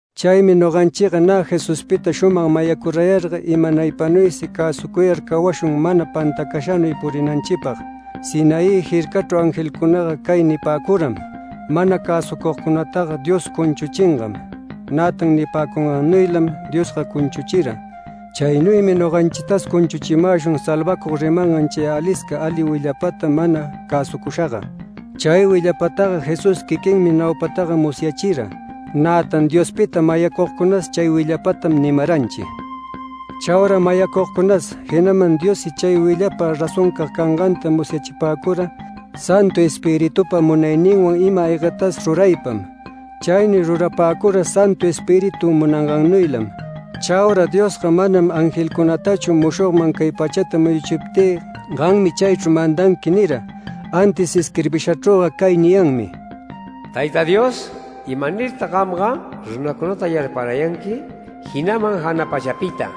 Chaymi noganchiga nä Jesuspita shumag mayacurayarga imanaypanuysi cäsucuyar cawashun mana pantacashanuy puriyänanchipag. Sinaí jircachru angelcunaga cay nipäcuram: “Mana cäsucugcunataga Diosga cunchuchingam”. Nätan nipäcungannuylam Diosga cunchuchira. Chaynuymi noganchitas cunchuchimäshun salvacug rimangan chay alisca ali willapata mana cäsucushaga. Chay willapataga Jesús quiquinmi naupataga musyachira, nätan Diospita mayacugcunas chay willapatam nimaranchi. Chaura mayacugcunas, jinaman Diossi chay willapa razoncag canganta musyachipäcura Santu Espiritupa munayninwan ima-aygatas ruraypam. Chaynuy rurapäcura Santu Espíritu munangannuylam. Chaura Diosga manam angelcunatachu “Mushogman cay pachata muyuchiptï, gammi chaychru mandanqui” nira. Antis isquirbishachrüga cay niyanmi: “Tayta Dios, ¿imanirtag gamga runacunata yarparayanqui, jinaman jana pachapita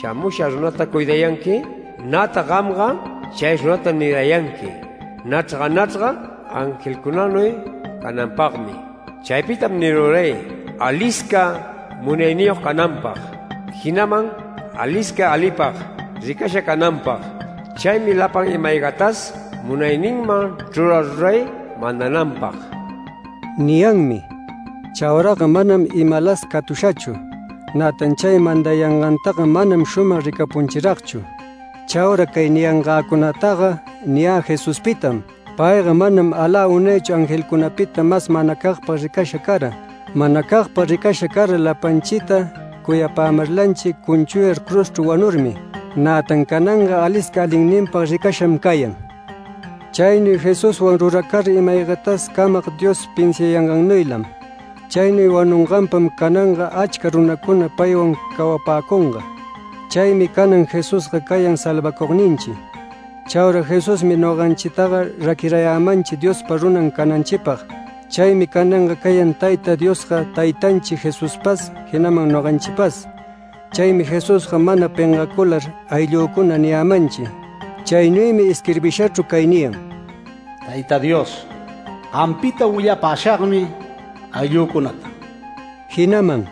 shamusha runata cuidayanqui? Nätan gamga chay runata nirayanqui nachrga nachrga angelcunanuy cananpagmi”. Chaypitam niruray: “Alisca munayniyog cananpag, jinaman alisca alipag ricasha cananpag. Chaymi lapan ima-aygatas munayninman chruraruray mandananpag” niyanmi. Chauraga manam imalas catushachu, nätan chay mandayangantaga manam shumag ricapunchiragchu. Chaura cay niyangäcunataga niyä Jesuspitam. Payga manam alä unaychu angelcunapita mas manacagpag ricasha cara. Manacagpag ricasha cara lapanchita cuyapämarlanchi cunchuyar cruzchru wanurmi. Nätan cananga alisca alinninpag ricasham cayan. Chaynuy Jesuswan ruracara ima-aygatas Camag Dios pinsiangannuylam. Chaynuy wanunganpam cananga achca runacuna paywan cawapäcunga. Chaymi canan Jesusga cayan salvacugninchi. Chaura Jesusmi noganchitaga raquirayämanchi Diospa runan cananchipag. Chaymi cananga cayan Tayta Diosga taytanchi Jesuspas, jinaman noganchipas. Chaymi Jesusga mana pengacular “Ayllücuna” niyämanchi. Chaynuymi isquirbishachru cay niyan: “Tayta Dios, gampita willapashagmi ayllücunata”. Jinaman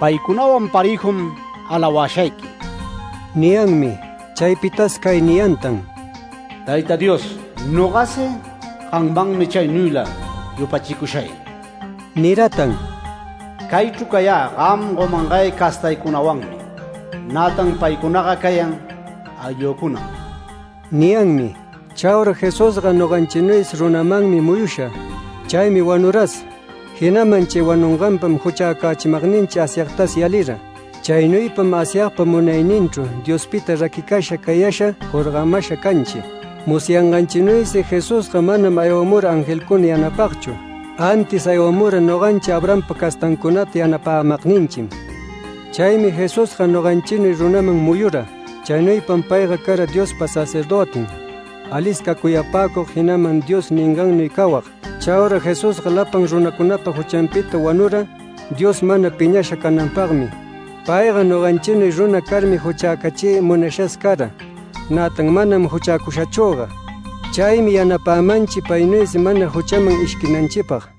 “Paycunawan parëjum alawashayqui” niyanmi. Chaypitas cay niyantan: “Tayta Dios, nogasi gammanmi chaynuyla yupachicushay”. Niratan: “Caychru cayä, gam gomangay castaycunawanmi, nätan paycunaga cayan ayllücunam” niyanmi. Chaura Jesusga noganchinuysi runamanmi muyusha. Chaymi wanuras, jinaman chay wanunganpam juchäcachimagninchi Asyagtas yalira. Chaynuypam Asyagpa munayninchru, Diospita raquicasha cayasha jorgamasha canchi. Musyanganchinuysi Jesusga manam aywamura angelcuna yanapagchu, antis aywamura noganchi Abrahampa castancunata yanapämagninchim. Chaymi Jesusga noganchinuy runaman muyura. Chaynuypam payga cara Diospa sacerdötin, alisca cuyapacug, jinaman Dios ningannuy cawag. Chaura Jesusga lapan runacunapa juchanpita wanura, Dios mana piñasha cananpagmi. Payga noganchinuy runa carmi juchäcachiy munashas cara, nätan manam juchäcushachüga. Chaymi yanapämanchi paynuysi mana juchaman ishquinanchipag.